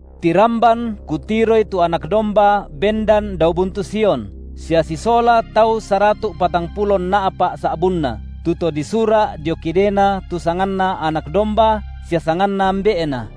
Tiramban kutiroi tu Anak domba bendan dao buntu Sion, sia sisola tau saratu’ patangpulo nna’pa’ sa’bunna, tu to disura’ dio kidena tu sanganNa Anak domba sia sanganNa Ambe’Na.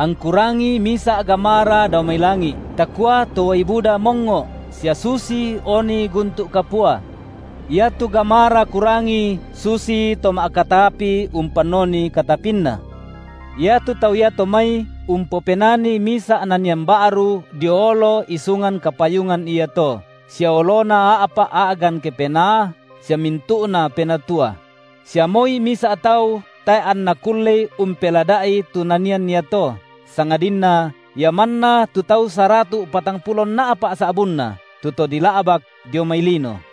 Angku rangi misa’ gamara dao mai langi’, takua to uai buda mongngo’, sia susi oni guntu’ kapua. Iatu gamara kurangi susito ma’katapi umpannoni katapinna; iatu tau iato mai umpopenani misa’ nanian ba’ru dio olo isungan kapayungan iato, sia olona a’pa’ a’gan kepenaa, sia mintu’na penatua; sia moi misa’ tau tae’ anna kullei umpelada’i tu nanian iato, sangadinna ia manna tu tau saratu’ patangpulo nna’pa’ sa’bunna tu to dila’bak dio mai lino.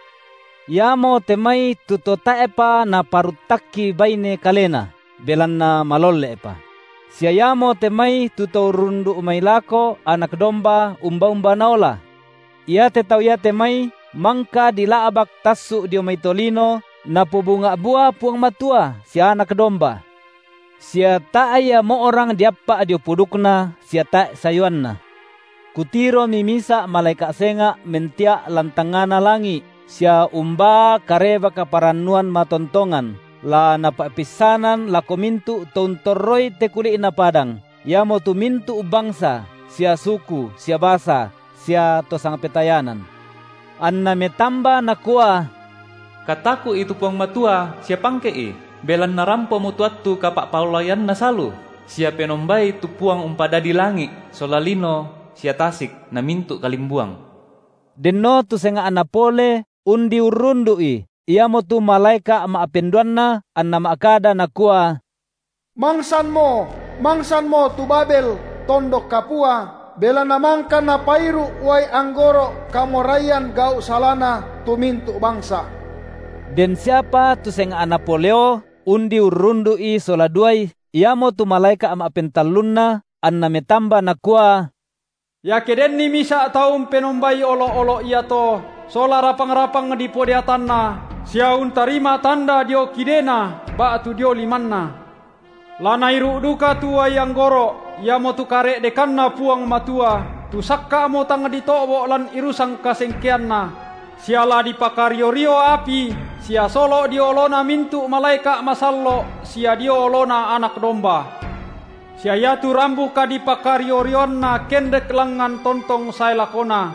Iamote mai tu to tae’pa naparuttakki baine kalena, belanna malolle’pa; sia iamote mai tu to urrundu’ mai lako Anak domba umba-umba Naola. Iate tau iate mai mangka dila’bak tassu’ dio mai tolino Napobunga’ bua Puang Matua sia Anak domba. Sia tae’ ia mo’rang diappa’ dio pudukna sia tae’ sayuanna. Kutiromi misa’ malaeka’ senga’ mentia’ lan tangngana langi’, sia umbaa Kareba-kaparannuan matontongan, la napa’peissanan lako mintu’ to untorroi te kuli’na padang, iamotu mintu’ bangsa sia suku sia basa sia to sangpetayanan, anna metamba nakua: Kataku’i tu Puang Matua sia pangke’I, belanna rampomo tu attu kapa’paolaianNa salu, sia penombai tu Puang umpadadi langi’ sola lino sia tasik na mintu’ kalimbuang. Denno tu senga’na pole, undi urrundu’i, iamotu malaeka’ ma’penduanna anna ma’kada nakua: Mangsanmo, mangsanmo tu Babel, tondok kapua, belanna mangka napairu’ uai anggoro’ kamoraian gau’ salana tu mintu’ bangsa. Den siapa tu senga’na poleo undi urrundu’i sola duai iamotu malaeka’ ma’pentallunna, anna metamba nakua: Iake denni misa’ tau umpenombai olo’-olo’ iato sola rapang-rapang dipodeatanna sia untarima tanda dio kidena ba’tu dio limanna, la nairu’ duka tu uai anggoro’ iamotu kare’dekanNa Puang Matua, tu sakka’mo tang dito’bo’ lan irusan kasengkeanNa; sia la dipakario-rio api sia solo’ dio olona mintu’ malaeka’ masallo’ sia dio oloNa Anak domba, sia iatu rambu kadipakario-rioanna kendek langngan tontong sae lakona: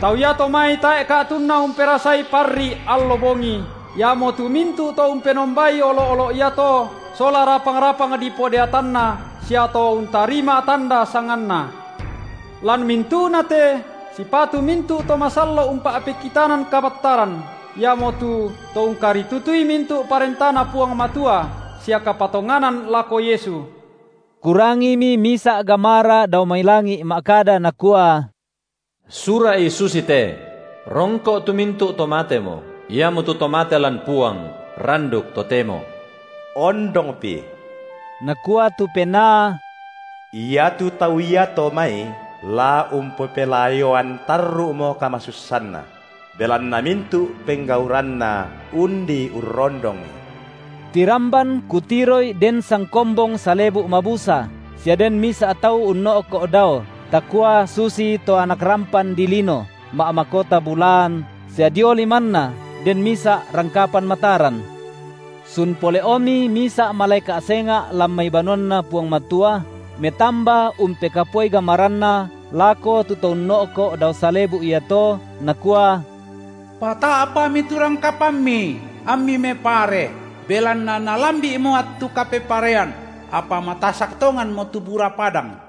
tau iato mai tae’ ka’tunna umperasai parri’ allo bongi, iamotu mintu’ to umpenombai olo’-olo’ iato sola rapang-rapang dipodeatanna sia to untarima tanda sanganna. Lan mintu’na te sipatu mintu’ to masallo’ umpa’pekitanan kabattaran, iamotu to ungkaritutui mintu’ parentaNa Puang Matua, sia kapatonganan lako Yesu. Kurangimi misa’ gamara dao mai langi’ ma’kada nakua: Sura’i susite: Rongko’ tu mintu’ to matemo, iamotu to mate lan Puang randuk totemo. Ondongpi, nakua tu Penaa, iatu tau iato mai la umpelayoan tarru’mo kamasussanna; belanna mintu’ penggauranna undi urrondongi. Tiramban kutiroi den sangkombong salebu’ mabusa, sia den misa’ tau unno’ko’ dao, takua susito Anak rampan dilino, ma’makota bulaan, sia dio limanNa den misa’ rangkapan mataran. Sun pole’omi misa’ malaeka’ senga’ lan mai banuanNa Puang Matua, metamba umpekapuai gamaranna lako tu To unno’ko’ dao salebu’ iato, nakua: Pata’pami tu rangkapanMi, amMi mepare, belanna nalambi’mo attu kapeparean, apa matasak tonganmo tu bura padang.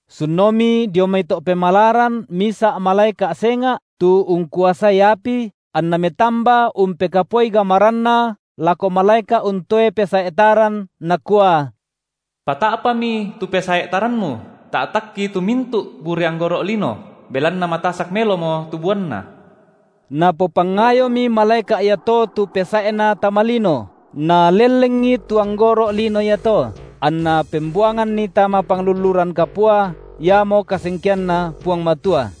Sunomi dio mai to’ pemalaran misa’ malaeka’ senga’, tu ungkuasai api, anna metamba umpekapuai gamaranna lako malaeka’ untoe pesae’ taran, nakua: Pata’pami tu pesae’ taranmu, ta’takki tu mintu’ bure anggoro’ lino, belanna matasak melomo tu buanna. Napopangayomi malaeka’ iato tu pesae’na tama lino, nalellengi tu anggoro’lino iato, anna pembuanganni tama panglulluran kapua, iamo kasengkeanNa Puang Matua;